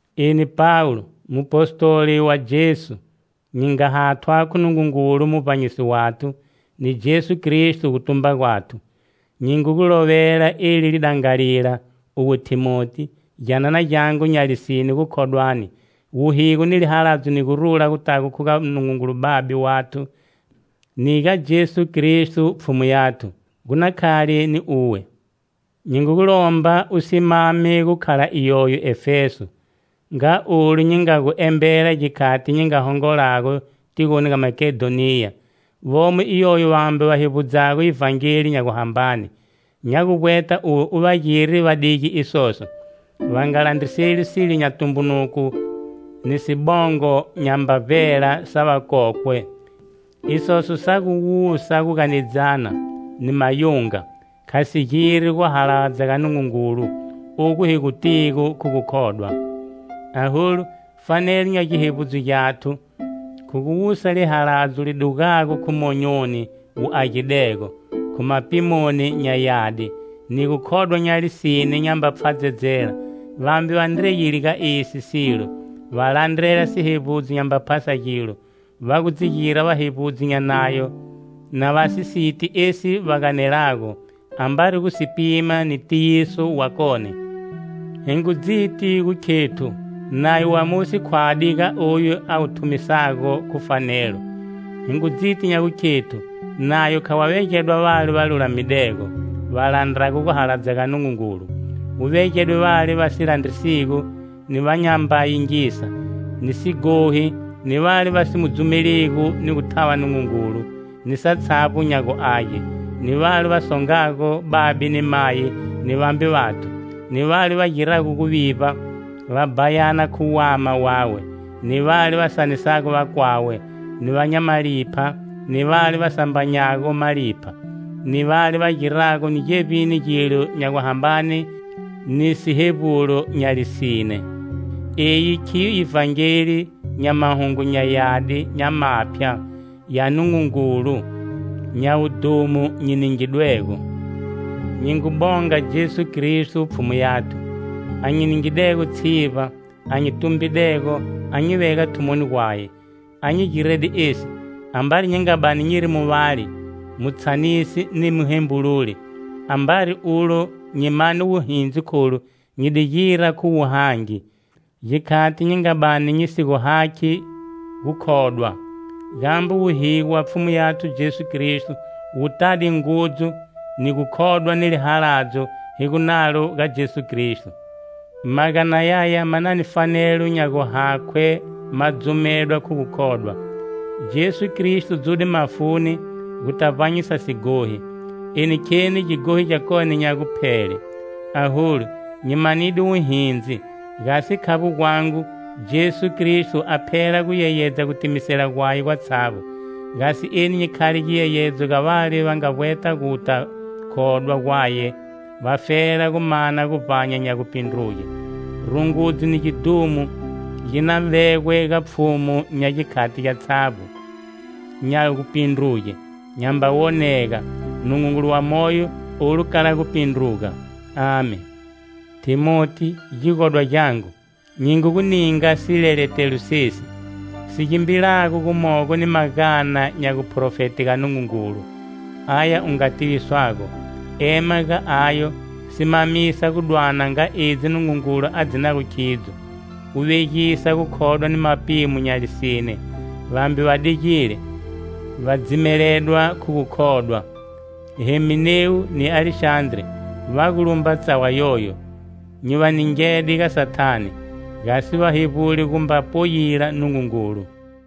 Eni Pawulo, Mupostoli wa Jesu, nyi nga hathwa khu Nungungulu Muvbanyisi wathu ni Jesu Kristo gutumba gwathu, nyi ngu gu lovela eli lidangalila, uwe Thimoti, gyanana gyangu nya lisine gukhodwani. Wuhigo ni lihaladzo ni gurula gutago khu ga Nungungulu Babe wathu ni ga Jesu Kristo, Pfhumu yathu, gu na khale ni uwe. Nyi ngu gu lomba u simame gukhala iyoyo Efeso, nga olu nyi nga gu embela gikhati nyi nga hongolago tigoni ga Makedhoniya. Vomo iyoyo vambe va hevbudzago Ivhangeli nya guhambane. Nya gu vbweta uwe u va gire va dige isoso. Va nga landriseli silo nya tumbunuko ni sibongo nyamba vbela sa vakokwe. Isoso sa gu wusa guganedzana ni mayunga, kha si giri guhaladza ga Nungungulu, ogu hi gu tigo khu gukhodwa. Aholu, fanelo nya gihevbudzo gyathu, khu guwusa lihaladzo li dugago khu monyoni wu agidego, khu mapimoni nya yadi, ni gukhodwa nya lisine nyamba pfhadzedzela, Vambe va ndreyile ga esi silo, va landrela sihevbudzo nyamba phasa gilo. Va gu dzi gira vahevbudzi nya Nayo na va si siti esi va ganelago, ambari gu si pima ni tiyiso wakone. Hi ngu dziti gu khethu Nayo wa Mosi khwadi ga oyu a wu thumisago khu fanelo. Hi ngu dziti nya gukhethu Nayo kha wa vegedwa vale va lulamidego, va landrago guhaladza ga Nungungulu, wu vegedwe vale va si landrisigo, ni va nyamba yingisa, ni sighohi, ni vale va si mu dzumeligo ni gu thava Nungungulu ni satshavbo nya guage, ni vale va songago babe ni mayi ni vambe vathu, ni vale va girago guvivba, va bhayana khu wama wawe, ni vale va sanisago vakwawe, ni va nya malipha, ni vale va sambanyago malipha, ni vale va girago ni gevbini gilo nya guhambane ni sihevbulo nya lisine. Eyi khiyo Ivhangeli nya Mahungu nya Yadi nya Maphya ya Nungungulu nya wudhumo nyi ningidwego. Nyi ngu bonga Jesu Kristo, Pfhumu yathu, a nyi ningidego tshivba, a nyi tumbidego a nyi vega thumoni gwaye. A nyi girede esi, ambari nyi nga bani nyiri muvali, mutshanisi ni muhembululi. Ambari ulo, nyi mane wuhindzi kholu, nyi di gira khu wuhangi, gikhati nyi nga bani nyi si gu hakhi gukhodwa. Gambe wuhigo wa Pfhumu yathu Jesu Kristo wu tade ngudzu ni gukhodwa ni lihaladzo hi gu nalo ga Jesu Kristo. Magana yaya ma na ni fanelo nya guhakhwe ma dzumedwa khu gukhodwa: Jesu Kristo dzude mafuni guta vbanyisa sighohi, eni kheni gighohi gyakone nya guphele. Aholu, nyi manide wuhindzi, gasi khavbo gwangu, Jesu Kristo a phela gu yeyedza gutimisela gwaye gwatshavbo, gasi eni nyi khale giyeyedzo ga vale va nga vbweta guta khodwa gwaye, vafela gu mana guvbanya nya gupindruge. Rungudzo ni gidhumo gi na vegwe ga Pfhumu nya gikhati gyatshavbo, nya gupindruge, nyamba wonega, Nungungulu wa moyo, olu kala gupindruga, Amen. Thimoti, gigodwa gyangu, nyi ngu gu ninga sileletelo sesi, si gimbilago gumogo ni magana nya guprofete ga Nungungulu, aya u nga tiviswago. Ema ga ayo, simamisa gu dwana nga edzi Nungungulu a dzinago khidzo, u vegisa gukhodwa ni mapimo nya lisine. Vambe va digile, va dzimeledwa khu gukhodwa. Heminewu ni Alexandre va gu lumba tsawa yoyo, nyi va ningede ga Sathane gasi va hevbule gumba poyila Nungungulu.